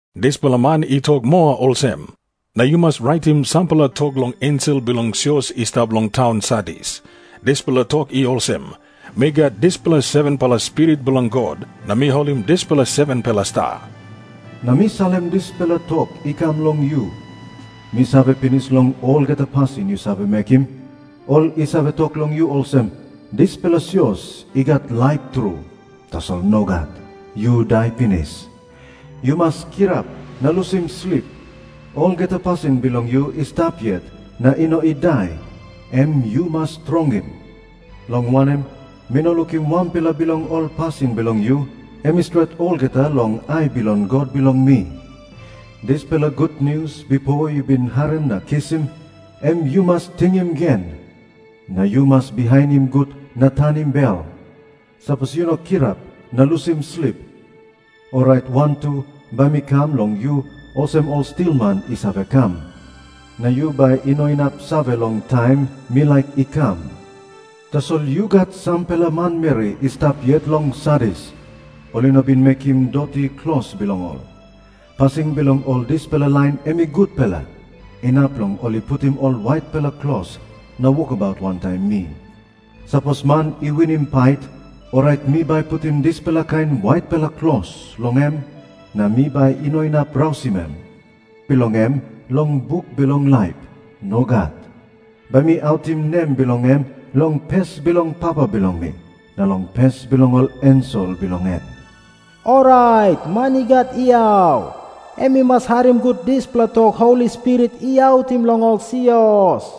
Dispela man i tok moa olsem, “Na yu mas raitim sampela tok long ensel bilong sios i stap long taun Sardis. Dispela tok i olsem, ‘Mi gat dispela 7-pela spirit bilong God, na mi holim dispela 7-pela sta. Na mi salim dispela tok i kam long yu. Mi save pinis long olgeta pasin yu save mekim. Ol i save tok long yu olsem, “Dispela sios i gat laip tru.” Tasol nogat, yu dai pinis. Yu mas kirap na lusim slip. Olgeta pasin bilong yu i stap yet na i no i dai, em yu mas strongim. Long wanem, mi no lukim wanpela bilong ol pasin bilong yu em i stret olgeta long ai bilong God bilong mi. Dispela gutnius bipo yu bin harim na kisim, em yu mas tingim gen. Na yu mas bihainim gut na tanim bel. Sapos yu no kirap na lusim slip, orait wantu bai mi kam long yu olsem ol stilman i save kam. Na yu bai i no inap save long taim mi laik i kam. “ ‘Tasol yu gat sampela manmeri i stap yet long Sardis, ol i no bin mekim doti klos bilong ol. Pasin bilong ol dispela lain em i gutpela, inap long ol i putim ol waitpela klos na wokabaut wantaim mi. “ ‘Sapos man i winim pait, orait mi bai putim dispela kain waitpela klos long em, na mi bai i no inap rausim nem bilong em long buk bilong laip. Nogat. Bai mi autim nem bilong em long pes bilong Papa bilong mi, na long pes bilong ol ensel bilong en. Orait man i gat yau, em i mas harim gut dispela tok Holi Spirit i autim long ol sios.’”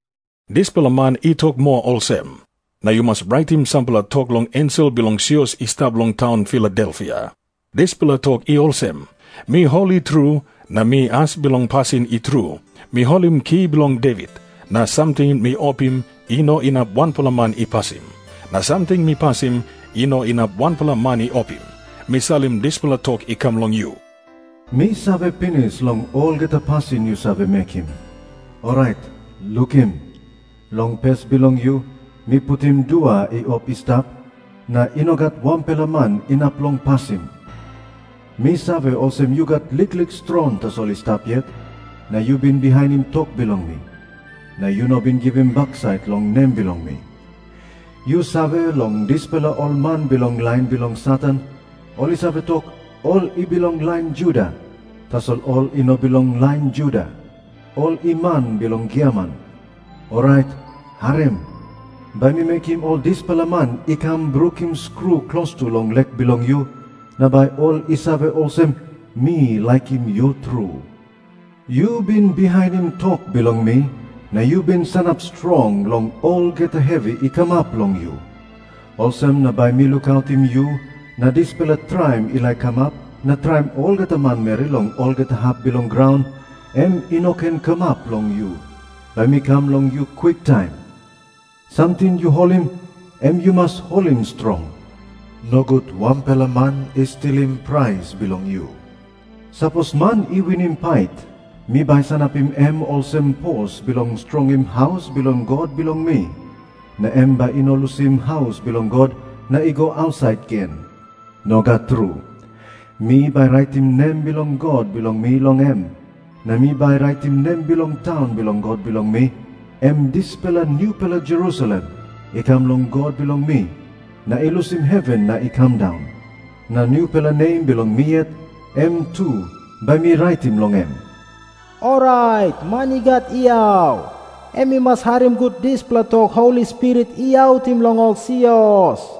Dispela man i tok moa olsem, “Na yu mas raitim sampela tok long ensel bilong sios i stap long taun Filadelfia. Dispela tok i olsem, ‘Mi holi tru, na mi as bilong pasin i tru. Mi holim ki bilong Devit, na samting mi opim, i no inap wanpela man i pasim. Na samting mi pasim, i no inap wanpela man i opim. Mi salim dispela tok i kam long yu. Mi save pinis long olgeta pasin yu save mekim. Orait lukim. Long pes bilong yu, mi putim dua i op i stap, na i no gat wanpela man inap long pasim. Mi save olsem yu gat liklik strong tasol i stap yet, na yu bin bihainim tok bilong mi, na yu no bin givim baksait long nem bilong mi. Yu save long dispela ol man bilong lain bilong Satan, ol i save tok, ol i bilong lain Juda. Tasol ol i no bilong lain Juda. Ol i man bilong giaman. Orait harim. Bai mi mekim ol dispela man i kam brukim skru klostu long lek bilong yu, na bai ol i save olsem, mi laikim yu tru. Yu bin bihainim tok bilong mi, na yu bin sanap strong long olgeta hevi i kamap long yu. Olsem na bai mi lukautim yu, na dispela traim i laik kamap na traim olgeta manmeri long olgeta hap bilong graun, em i no ken kamap long yu. Bai mi kam long yu kwiktaim. Samting yu holim, em yu mas holim strong. Nogut wanpela man i stilim prais bilong yu. “ ‘Sapos man i winim pait, mi bai sanapim em olsem pos bilong strongim haus bilong God bilong mi, na em bai i no lusim haus bilong God na i go ausait gen. Nogat tru. Mi bai raitim nem bilong God bilong mi long em, na mi bai raitim nem bilong taun bilong God bilong mi, em dispela nupela Jerusalem i kam long God bilong mi, na i lusim heven na i kam daun. Na nupela nem bilong mi yet, em tu bai mi raitim long em. Orait man i gat yau, em i mas harim gut dispela tok Holi Spirit i autim long ol sios.’”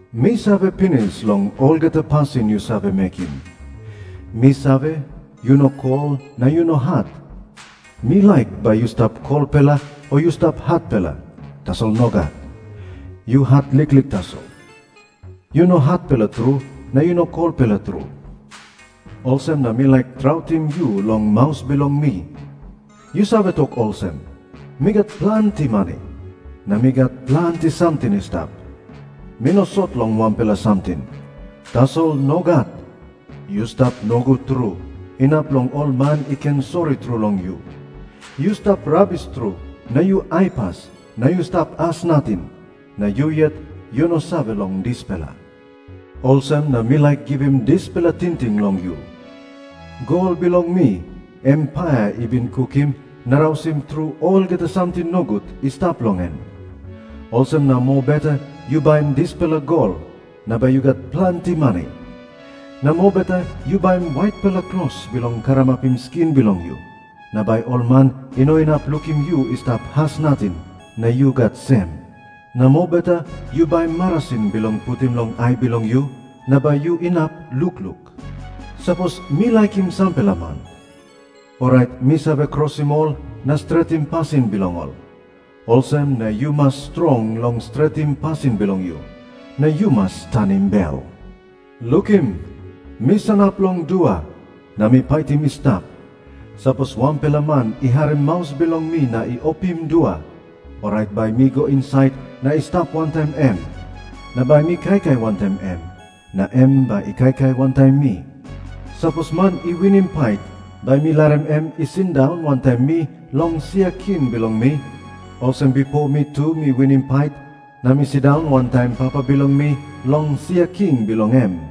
Mi save pinis long olgeta pasin yu save mekim. Mi save, yu no kol na yu no hat. Mi laik bai yu stap kolpela o yu stap hatpela. Tasol nogat. Yu hat liklik tasol. Yu no hatpela tru na yu no kolpela tru. Olsem na mi laik trautim yu long maus bilong mi. Yu save tok olsem, “Mi gat planti mani, na mi gat planti samting i stap. Mi no sot long wanpela samting.” Tasol nogat. Yu stap nogut tru, inap long ol man i ken sori tru long yu. Yu stap rabis tru na yu aipas na yu stap as nating. Na yu yet yu no save long dispela. Olsem na mi laik givim dispela tingting long yu. Gol bilong mi, em paia i bin kukim na rausim tru olgeta samting nogut i stap long en. Olsem na mobeta yu baim dispela gol, na bai yu gat planti mani. Na mobeta yu baim waitpela klos bilong karamapim skin bilong yu, na bai ol man i no inap lukim yu i stap as nating na yu gat sem. Na mobeta yu baim marasin bilong putim long ai bilong yu, na bai yu inap lukluk. Sapos mi laikim sampela man, orait mi save krosim ol na stretim pasin bilong ol. Olsem na yu mas strong long stretim pasin bilong yu, na yu mas tanim bel. “ ‘Lukim, mi sanap long dua, na mi paitim i stap. Sapos wanpela man i harim maus bilong mi na i opim dua, orait bai mi go insait na i stap wantaim em. Na bai mi kaikai wantaim em, na em bai i kaikai wantaim mi. Sapos man i winim pait, bai mi larim em i sindaun wantaim mi long sia king bilong mi, olsem bipo mi tu mi winim pait, na mi sindaun wantaim Papa bilong mi long sia king bilong em.